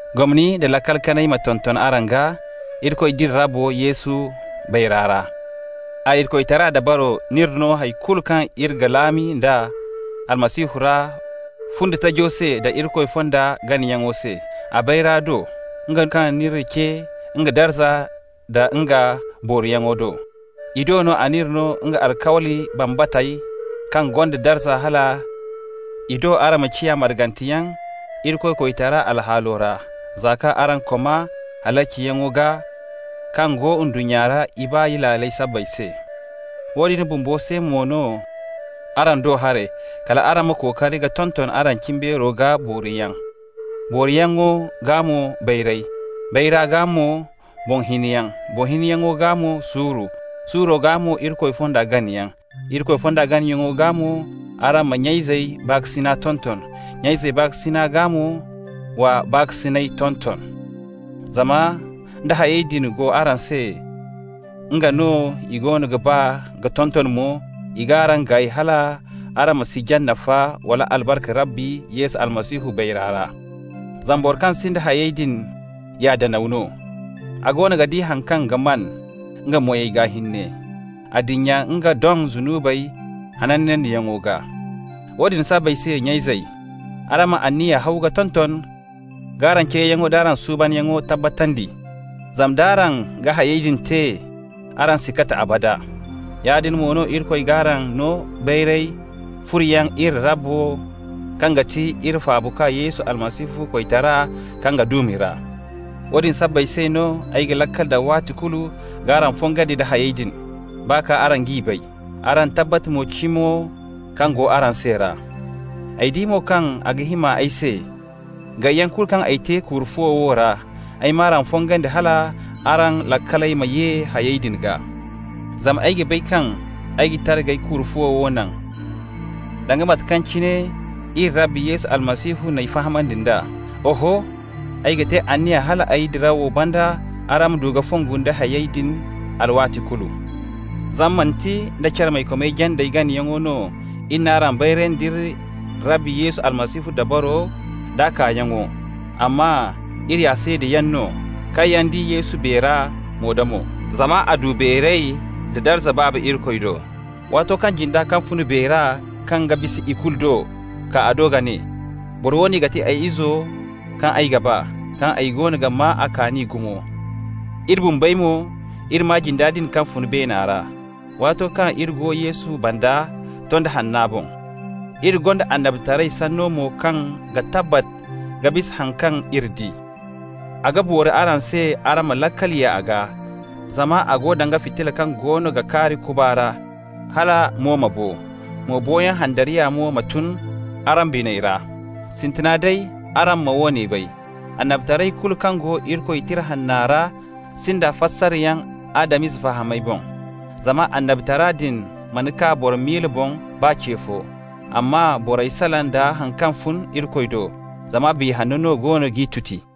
Gomni nda laakal kanay ma tonton araŋ gaa, Irikoy d'iri Rabbo Yesu bayra ra. A Irikoytara dabaro n'iri no hay kulu kaŋ iri ga laami nd'a Almasihu ra fundi tajo se da Irikoy fonda ganayaŋo se, a bayra do, nga kaŋ n'iri ce nga darza nda nga booriyaŋo do. I do no a n'iri no nga alkawli bambatey kaŋ gonda darza hal i do araŋ ma ciya marganteyaŋ Irikoytara alhaalo ra, za kaŋ araŋ koma halaciyaŋo gaa kaŋ go ndunnya ra ibaay laaley sabbay se. Woodin bumbo se mo no, araŋ do haray, kal araŋ ma kookari ka tonton araŋ cimbeero gaa booriyaŋ, booriyaŋo gaa mo, bayray, bayra gaa mo, boŋ hiniyaŋ, boŋ hiniyaŋo gaa mo, suuru, suuro gaa mo Irikoy fonda ganayaŋ. Irikoy fonda ganayaŋo gaa mo, araŋ ma nya-izey baakasinay tonton, nya-izey baakasina gaa mo, wa baakasinay tonton. Zama nda hayey din go araŋ se, nga no i goono ga baa ka tonton mo, i g'araŋ gaay hal araŋ ma si jaŋ nafa wala albarka Rabbi Yesu Almasihu bayra ra. Zama boro kaŋ sinda hayey din ya danaw no, a goono ga di haŋ kaŋ ga maan nga moy gaa hinne. A dinya nga doŋ zunubey hanandiyaŋo gaa. Woodin sabbay se, nya-izey, araŋ ma anniya haw ka tonton k'araŋ ceeyaŋo d'araŋ suubanyaŋo tabbatandi. Zama nd'araŋ ga hayey din te, araŋ si kati abada. Yaadin mo no Irikoy g'araŋ no beeray furoyaŋ iri Rabbo kaŋ ga ti iri Faabakwa Yesu Almasihu koytara kaŋ ga duumi ra. Woodin sabbay se no ay ga laakal daŋ waati kulu k'araŋ fongandi nda hayey din, baa kaŋ araŋ g'i bay, araŋ tabbat mo cimo kaŋ go araŋ se ra. Ay di mo kaŋ a ga hima ay se, gayyaŋ kulu kaŋ ay te kuuru-fuwo wo ra, ay m'araŋ fongandi hal araŋ laakaley ma ye hayey din gaa. Zama ay ga bay kaŋ ay ga tara k'ay kuuru-fuwo wo naŋ, danga mate kaŋ cine iri Rabbi Yesu Almasihu n'ay fahamandi nd'a. Oho, ay ga te anniya hal ay dirawo banda araŋ ma du ka fongu nda hayey din alwaati kulu. Zama manti nda carmaykomey jandey ganayaŋ no iri n'araŋ bayrandi nd'iri Rabbi Yesu Almasihu dabaro d'a kaayaŋo, amma iri ya seedayaŋ no kaŋ yaŋ di Yesu beera mo-da-mo. Zama a du beeray da darza Baaba Irikoy do, waato kaŋ jinda kaŋ fun beera kaŋ ga bisa ikulu do kaa a do ka ne: «Boro woone ga ti ay Izo kaŋ ay ga ba, kaŋ ay goono ga maa a kaani gumo.» Iri bumbey mo, iri maa jinda din kaŋ fun beena ra, waato kaŋ iri go Yesu banda tondi hanna boŋ. Iri gonda annabitaray sanno mo kaŋ ga tabbat ka bisa haŋ kaŋ iri di. A ga boori araŋ se araŋ ma laakal ye a gaa, zama a go danga fitilla kaŋ goono ga kaari kuba ra, hala mo ma bo, mo boyaŋ handariya mo ma tun araŋ biney ra. Sintina day araŋ ma woone bay: annabitaray kulu kaŋ go Irikoy Tira Hanna ra sinda fasaryaŋ Adam-ize fahamay boŋ. Zama annabitara din mana kaa boro miila boŋ baa ce fo, amma borey salaŋ da haŋ kaŋ fun Irikoy do, zama Biya Hanno no goono g'i tuti.